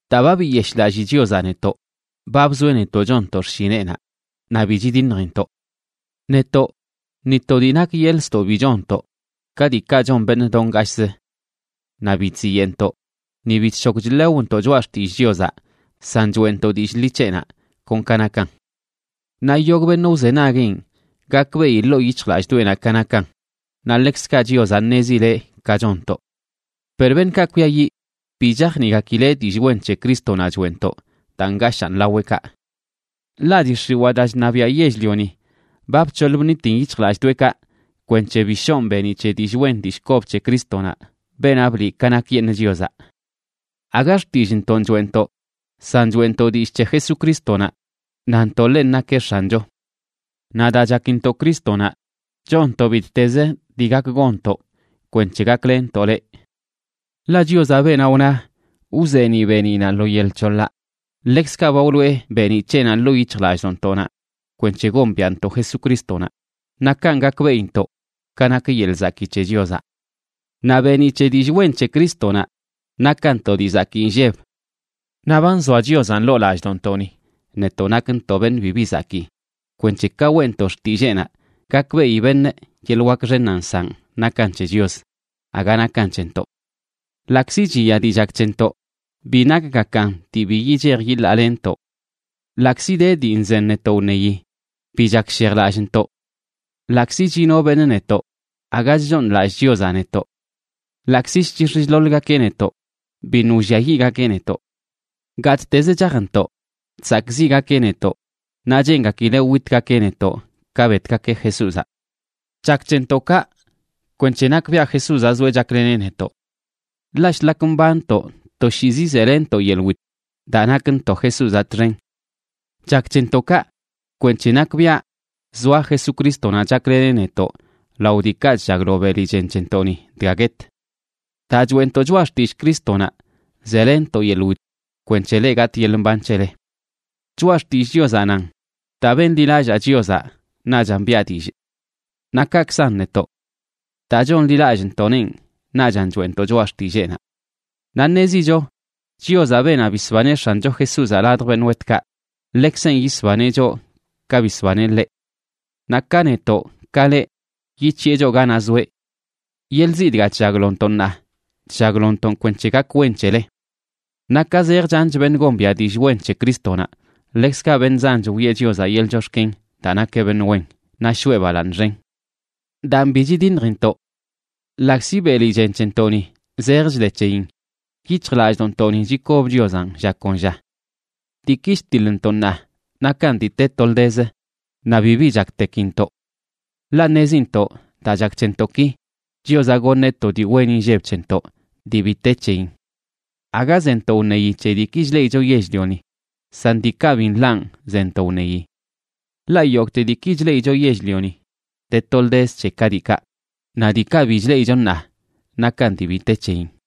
Daa ba biyeshꞌlallii Chiozaꞌ netoꞌ, ba bzoeꞌ netoꞌ chonntoꞌ xshineꞌnaꞌ, naꞌ bi chidiṉjintoꞌ. Netoꞌ, ni to dii nak yeḻꞌ ztoꞌ bi chonntoꞌ, ka diikaꞌ chon beṉꞌ do ngashꞌzə. Naꞌ bi chziyeꞌntoꞌ, ni bi chshok chlewntoꞌ choꞌa xtillꞌ Chiozaꞌ, san choeꞌntoꞌ dillꞌ ḻi c̱heꞌnaꞌ kon ka nakan. Naꞌ yogꞌ beṉꞌ wzenagueꞌn, gakbeꞌi ḻoo yic̱hjlallꞌdoꞌenaꞌ ka nakan, naꞌ ḻekzkaꞌ Chiozaꞌ ṉezileꞌ ka chonntoꞌ. Per beṉꞌkaꞌ kwiayiꞌ, bi chajniꞌgakileꞌ dillꞌ wen c̱he Crístonaꞌ choeꞌntoꞌ, daa ngashaan laweꞌkaꞌ. Ḻaꞌ dii x̱iwaa daa chṉabiaꞌ yell-lioni, ba bc̱hoḻ bṉitin yic̱hjlallꞌdoꞌekaꞌ kwenc̱he bi shoꞌn beeniꞌ c̱he dillꞌ wen dillꞌ kob c̱he Crístonaꞌ, beenaꞌ bliꞌ ka nakyeṉꞌ Chiozaꞌ. Aga xtillꞌntonꞌ choeꞌntoꞌ, san choeꞌntoꞌ dillꞌ c̱he Jesucrístonaꞌ, nantoꞌ ḻenꞌ nakeꞌ X̱ancho. Naꞌ daa chakintoꞌ Crístonaꞌ, chonntoꞌ bittez dii gak gonntoꞌ kwenc̱he gaklenntoꞌ leꞌ. Ḻaꞌ Chiozaꞌ, beenaꞌ wna: “Wzeeniꞌ beeniꞌnaꞌ lo yel c̱hoḻaꞌ”, ḻekzkaꞌ ba wloꞌe beeniꞌ c̱heꞌnaꞌ ḻoo yic̱hjlallꞌdoꞌntoꞌnaꞌ kwenc̱he gombiaꞌntoꞌ Jesucrístonaꞌ, naꞌ kanꞌ gakbeꞌintoꞌ ka nak yeḻꞌ zakii c̱he Chiozaꞌ. Naꞌ beeniꞌ c̱he dillꞌ wen c̱he Crístonaꞌ nakan to dii zakii inlleb. Naꞌ ba nzoa Chiozaꞌn ḻoo lallꞌdoꞌntoꞌni, netoꞌ nakntoꞌ beṉꞌ bibi zakii, kwenc̱he ka weꞌntoꞌ xtilleenaꞌ, gakbeꞌi beṉꞌ yeḻꞌ wak xennaꞌ nsaꞌn nakan c̱he Chios, aga nakan c̱hentoꞌ. Ḻaꞌkzi chiya dii chak c̱hentoꞌ, bi nakgakan dii bi yichej yilalenntoꞌ. Ḻaꞌkzi de dii nzen netoꞌ wṉeyi, bi chakshejlallꞌntoꞌ. Ḻaꞌkzi chino beṉꞌ netoꞌ, aga chchooṉlallꞌ Chiozaꞌ netoꞌ. Ḻaꞌkzi chchix̱ chḻoḻgakeꞌ netoꞌ, biṉꞌ wlliayiꞌgakeꞌ netoꞌ. Gattezə chajntoꞌ, chsakꞌziꞌgakeꞌ netoꞌ naꞌ cheengakileꞌ witgakeꞌ netoꞌ ka betgakeꞌ Jesúzaꞌ. Chak c̱hentoꞌ kaꞌ kwenc̱he nakbiaꞌ Jesúzaꞌ zoeꞌ chakleneꞌ netoꞌ. Ḻaꞌ shlak mbanntoꞌ, toshiizi zelenntoꞌ yeḻꞌ wit daa nakntoꞌ Jesúzaꞌ txen. Chak c̱hentoꞌ kaꞌ kwenc̱he nakbiaꞌ zoa Jesucrístonaꞌ chakleneꞌ netoꞌ lao diikaꞌ chllaglo beli chen c̱hentoꞌni dga guet. Daa choeꞌntoꞌ choꞌa xtillꞌ Crístonaꞌ zelenntoꞌ yeḻꞌ wit, kwenc̱he leꞌ gatꞌ yeḻꞌ mban c̱hele. Choꞌa Xtillꞌ Chiozaꞌ nan: “Daa benḻilallaa Chiozaꞌ, naꞌchan biꞌa dillꞌ.” Naꞌ kakzan netoꞌ, daa chonḻilallꞌntoꞌneꞌn, naꞌchan choeꞌntoꞌ choꞌa xtilleenaꞌ. Naꞌ ṉezicho Chiozaꞌ, beenaꞌ bisbaneꞌ X̱ancho Jesúzaꞌ ladj beṉꞌ wetkaꞌ, ḻekzenꞌ yisbaneꞌ choꞌ ka bisbaneꞌ ḻeꞌ. Naꞌ ka netoꞌ ka leꞌ, yic̱hiꞌe choꞌ ganaꞌ zoeꞌ. Yeḻꞌ ziꞌ dga chllaglontoꞌ ṉaa, chllaglontoꞌn kwenc̱he gak wen c̱hele. Naꞌ ka zej chanch beṉꞌ gombiaꞌ dillꞌ wen c̱he Crístonaꞌ, ḻekzkaꞌ beṉꞌ zanch wiꞌe Chiozaꞌ yeḻꞌ chox̱ken daa nakeꞌ beṉꞌ wen, naꞌ shoꞌe balaaṉ xen. Daan bi chidiṉjintoꞌ. Ḻaꞌkzi beli chen c̱hentoꞌni zej chde c̱heyin, yic̱hjlallꞌdoꞌntoꞌni chikob Chiozaꞌn lla kon lla. Diiki chtiḻntoꞌ ṉaa, nakan dii te toldezə, naꞌ bibi chaktekintoꞌ. Ḻaꞌ ṉezintoꞌ daa chak c̱hentoꞌ ki, Chiozaꞌ goṉeꞌ to dii wen inlleb c̱hentoꞌ dii bi te c̱heyin. Aga zentoꞌ wṉeyi c̱he diiki chleꞌicho yell-lioni, san diikaꞌ bi nḻaꞌn zentoꞌ wṉeyi. Ḻaꞌ yogꞌte diiki chleꞌicho yell-lioni, de toldezə c̱he ka diikaꞌ, naꞌ diikaꞌ bi chleꞌicho ṉaa, nakan dii bi te c̱heyin.